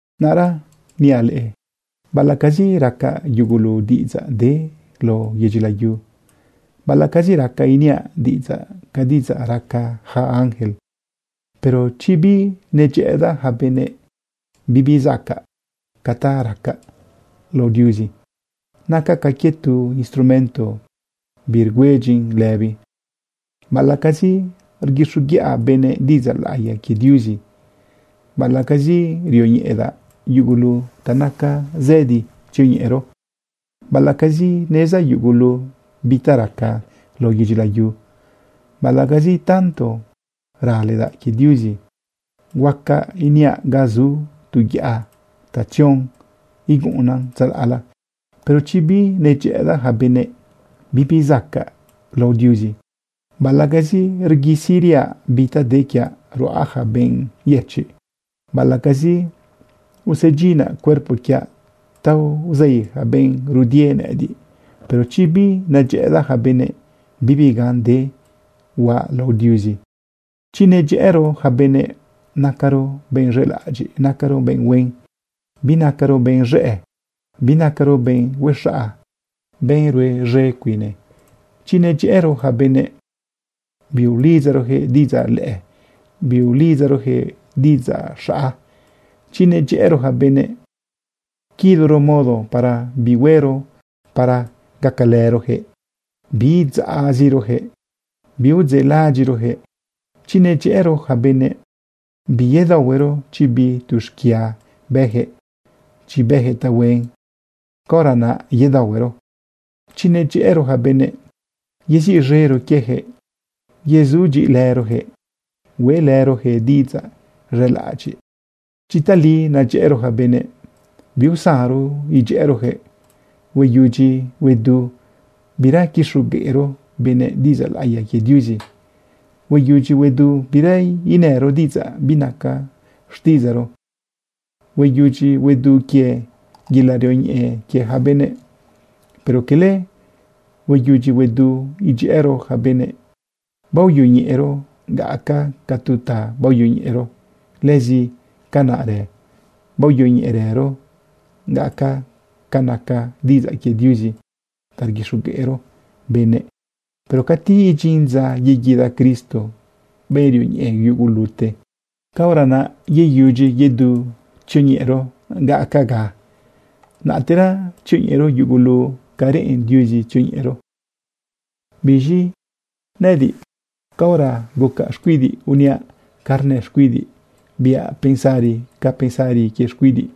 Naꞌra niaꞌ leꞌe, baꞌalaꞌcazi racaꞌ yugulu diꞌidzaꞌ de lao yedyi layu, baꞌalaꞌcazi racaꞌ iniaꞌ diꞌidzaꞌ ca diꞌidzaꞌ raca yaca ángel, pero chi binedyëꞌëdaꞌ yaca benëꞌ, bibi zacaꞌ ca ta racaꞌ lao Diuzi. Nacaꞌ ca quie tu instrumento birgüedyin lëbi. Baꞌalaꞌcazi rguixoguiꞌa benëꞌ diꞌidzaꞌ laꞌiya quie Diuzi, baꞌalaꞌcazi rioñeꞌedaꞌ yugulu ta nacan zëdi tzioñeꞌero, baꞌalaꞌcazi nezdaꞌ yugulu bi ta raca lao yedyi layu, baꞌalaꞌcazi tanto raledaꞌ quie Diuzi, huaca iniaꞌ ga zu tu yaꞌa ta tzion iguꞌunnan tzalaꞌla, pero chi binedyëꞌëdaꞌ yaca benëꞌ, bibi zacaꞌ lao Diuzi. Baꞌalaꞌcazi rguisiriaꞌ bi ta de quiaꞌ ruꞌa yaca benꞌ yëchiꞌ, baꞌalaꞌcazi usedyinaꞌ cuerpo quiaꞌ ta uzei yaca benꞌ rudie nëꞌëdiꞌ, pero chi binedyëꞌëdaꞌ yaca benëꞌ, bibi gan de biaꞌ lao Diuzi. Chi nedyëꞌëro yaca benëꞌ, nacaro benꞌ z̃elaꞌadyiꞌ, nacaro benꞌ huen. Binacaro benꞌ z̃ëꞌ, binacaro benꞌ huexaꞌa, benꞌ rue z̃e cuine. Chi nedyëꞌëro yaca benëꞌ, biulidzaroyaquëꞌ diꞌidzaꞌ lëꞌë, biulidzaroyaquëꞌ diꞌidzaꞌ xaꞌa. Chi nedyëꞌëro yaca benëꞌ, quiloro modo para bi huero para gacalëroyaquëꞌ, biidzaꞌziroyaquëꞌ, biudzeꞌlaꞌadyiꞌroyaquëꞌ. Chi nedyëꞌëro yaca benëꞌ, biyedaohuero chi bi tu xquia bëyaquëꞌ. Chi bëyaquëꞌ tahuen, caora naꞌ yedaohuero. Chi nedyëꞌëro yaca benëꞌ, yeziꞌz̃ero quieyaquëꞌ, yezudyiꞌilëroyaquëꞌ hueꞌlëroyaquëꞌ diꞌidzaꞌ z̃elaꞌadyiꞌ. Chi tali nedyëꞌëro yaca benëꞌ, biusanro idyëꞌëroyaquëꞌ. Hueyudyi huedu bira quixogueꞌro benëꞌ diꞌidzaꞌ laꞌiya quie Diuzi. Hueyudyi huedu bira inëro diꞌidzaꞌ binaca xtiꞌidzaꞌro. Hueyudyi huedu quie yelaꞌ rioñeꞌe quie yaca benëꞌ. Pero cala hueyudyi huedu idyëꞌëro yaca benëꞌ. Baoyoñeꞌero gaꞌacaga ca tu ta baoyoñeꞌero. Lëzi canaꞌrë baoyoñeꞌerëro gaꞌacaga ca naca diꞌidzaꞌ quie Diuzi ta rguixogueꞌro benëꞌ. Pero cati idyin dza yeguida Cristo, benꞌ rioñeꞌe yugulute, caora naꞌ yeyudyi yedu tzioñeꞌero gaꞌacaga, naꞌtera tzioñeꞌero yugulu ca reꞌen Diuzi tzioñeꞌero. Biz̃i nëꞌëdiꞌ, caora gucaꞌ xcuidiꞌ uniaꞌ ca rnë xcuidiꞌ, biaꞌ pensari ca pensari quie xcuidiꞌ.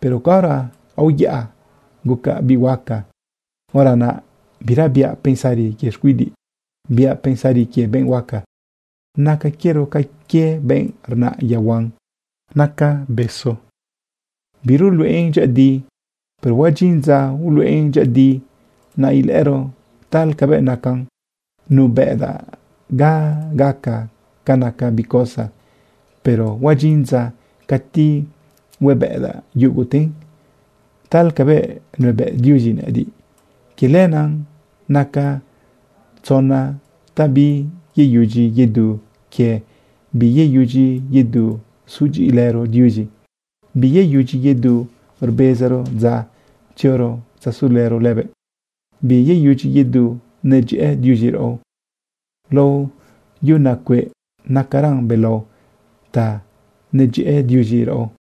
Pero caora uyaꞌa gucaꞌ biꞌ huaca, hora naꞌ bira biaꞌ pensari quie xquidiꞌ, biaꞌ pensari quie benꞌ huaca. Naca quiero ca quie benꞌ rnaꞌ yaohuan naca besu, biruluꞌen dyëꞌëdi, pero huadyin dza uluꞌen dyëꞌëdi, naꞌ ilëꞌëro tal cabëꞌ nacan. Nubëꞌdaꞌ gaꞌacaga ca naca bi cosa, pero huadyin dza cati huebëꞌdaꞌ yuguten tal cabëꞌ nuebëꞌ Diuzi nëꞌëdiꞌ. Quie lenaꞌ naca tzona ta biyeyudyi yedu quie. Biyeyudyi yedu zudyiꞌilëro Diuzi, biyeyudyi yedu rbezaro dza tzioro tzasulëro lëbëꞌ, biyeyudyi yedu nedyëꞌë Diuzi raꞌo. Lao yuna cueꞌ nacaran belao ta nedyëꞌë Diuzi raꞌo.